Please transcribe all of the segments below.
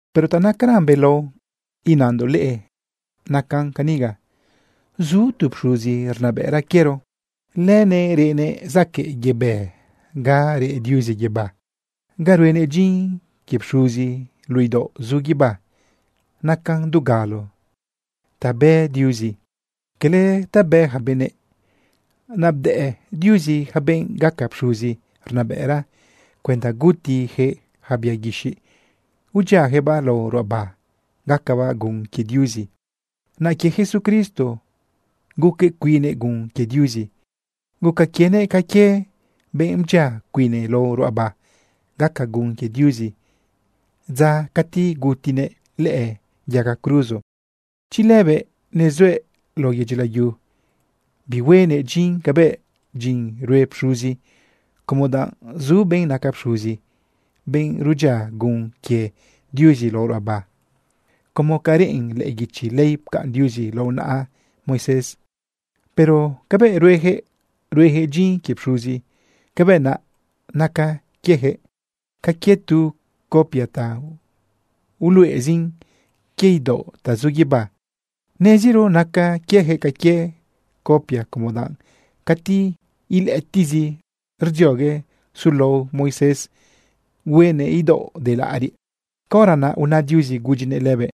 Pero ta nacaran belao inandoꞌ leꞌe, nacan caniga: Zu tu pxuzi rnabëꞌra quiero. Lëbëꞌ reꞌnëꞌ zaquëꞌ yebë ga reꞌ Diuzi guibá. Ga ruenëꞌ dyin quie pxuzi luꞌu idaoꞌ zu guibá nacan dugalo ta bë Diuzi, quele ta bë ja benëꞌ. Naꞌ bdëꞌ Diuzi ja benꞌ gaca pxuzi rnabëꞌra cuenda gutijëꞌ yaca bia guixiꞌ udyiajëꞌbaꞌ lao ruꞌaba gacabaꞌ gun quie Diuzi. Naꞌ quie Jesucristo guquëꞌ cuinnëꞌ gun quie Diuzi. Guca quienëꞌ ca quie benꞌ bdyia cuine lao ruꞌaba gaca gun quie Diuzi dza cati gutinëꞌ lëꞌë yaga cruzo. Chi lëbëꞌ nezuëꞌ lao yedyi layu, bihuenëꞌ dyin cabëꞌ dyin rue pxuzi como danꞌ zu benꞌ naca pxuzi, benꞌ rudyia gun quie Diuzi lao ruꞌaba como ca rnën lëꞌë guichi ley pcaꞌn Diuzi lao naꞌa Moisés. Pero cabëꞌ ruejëꞌ, ruejëꞌ dyin quie pxuzi, cabëꞌ naꞌ naca quiejëꞌ ca quie tu copia ta uluꞌezin quie idaoꞌ ta zu guibá. Neziro naca quiejëꞌ ca quie copia como danꞌ cati ilëꞌëtiꞌzi rdziogue sulao Moisés huenëꞌ idaoꞌ de laꞌariꞌ, caora naꞌ una Diuzi gudyinëꞌ lëbëꞌ: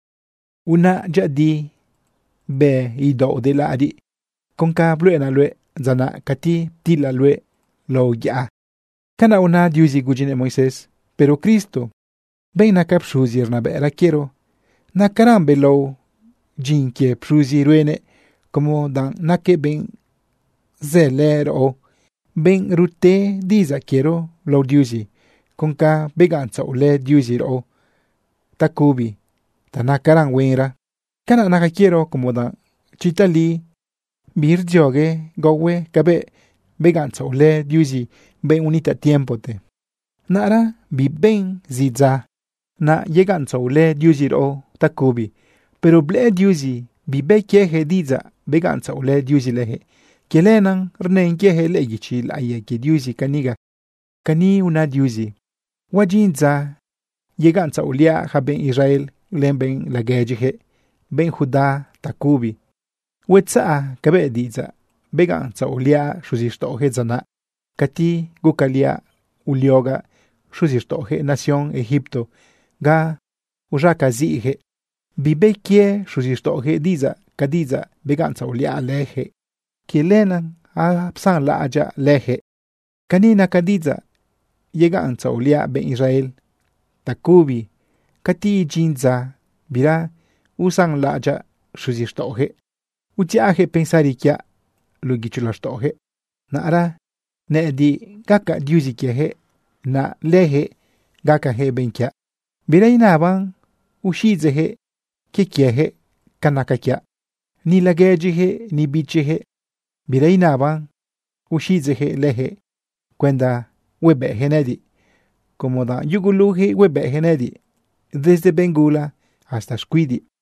“Unaꞌ dyëꞌëdi, bë idaoꞌ de laꞌariꞌ con ca bluꞌenaꞌ luëꞌ dza naꞌ cati ptilaꞌ luëꞌ lao yaꞌa.” Canaꞌuna Diuzi gudyinëꞌ Moisés. Pero Cristo, benꞌ naca pxuzi rnabëꞌra quiero, nacaran belao dyin quie pxuzi ruenëꞌ, como danꞌ naquëꞌ benꞌ zëlë raꞌo, benꞌ rute diꞌidzaꞌ quiero lao Diuzi con ca begaꞌntzaꞌolë Diuzi raꞌo tacubi ta nacaran huenra. Canaꞌ naca quiero como danꞌ chi tali birdziogue gaohue cabëꞌ begaꞌntzaꞌolë Diuzi benꞌ unitaꞌ tiempote, naꞌra biben zi dza naꞌ yegaꞌntzaꞌolë Diuzi raꞌo tacubi. Pero blëꞌë Diuzi bibë quieyaquëꞌ diꞌidzaꞌ begaꞌntzaꞌolë Diuzi lëjëꞌ. Quie lenaꞌ rnën quiejëꞌ lëꞌë guichi laꞌiya quie Diuzi caniga: Cani una Diuzi: Huadyin dza yegaꞌntzaꞌoliaꞌ yaca benꞌ Israel len benꞌ laguedyijëꞌ benꞌ Judá tacubi. Huetzaꞌ cabëꞌ diꞌidzaꞌ begaꞌntzaꞌoliaꞌ xuzixtaꞌojëꞌ dza naꞌ cati gucaliaꞌ uliogaꞌ xuzixtaꞌojëꞌ nación Egipto ga uz̃acaziꞌyaquëꞌ. Bibë quie xuzixtaꞌojëꞌ diꞌidzaꞌ ca diꞌidzaꞌ begaꞌntzaꞌoliaꞌ lëjëꞌ. Quie lenaꞌ apsanlaꞌadyaꞌ lëjëꞌ. Cani naca diꞌidzaꞌ yegaꞌntzaꞌoliaꞌ benꞌ Israel tacubi cati idyin dza bira usanlaꞌadyaꞌ xuzixtaꞌojëꞌ: Udziꞌajëꞌ pensari quiaꞌ luꞌu guicho laxtaꞌojëꞌ. Naꞌra nëꞌëdiꞌ gacaꞌ Diuzi quiejëꞌ, naꞌ lëjëꞌ gacajëꞌ benꞌ quiaꞌ. Bira inaban uxiꞌidzeꞌjëꞌ quie quiejëꞌ ca naca quiaꞌ. Ni laguedyijëꞌ, ni bichijëꞌ, bira inaban uxiꞌidzeꞌjëꞌ lëjëꞌ cuenda huebëꞌjëꞌ nëꞌëdiꞌ, como danꞌ yugulujëꞌ huebëꞌjëꞌ nëꞌëdiꞌ desde benꞌ gula hasta xcuidiꞌ.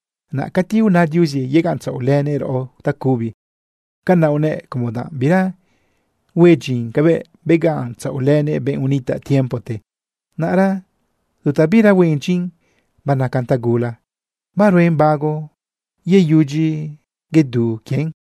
Naꞌ cati una Diuzi yegaꞌntzaꞌolënëꞌ raꞌo tacubi, canaꞌ unëꞌ como danꞌ bira hue dyin cabëꞌ begaꞌntzaꞌolënëꞌ benꞌ unitaꞌ tiempote. Naꞌra tu ta bira huen dyin banacan tagula, baruen bago yeyudyi yedu quien.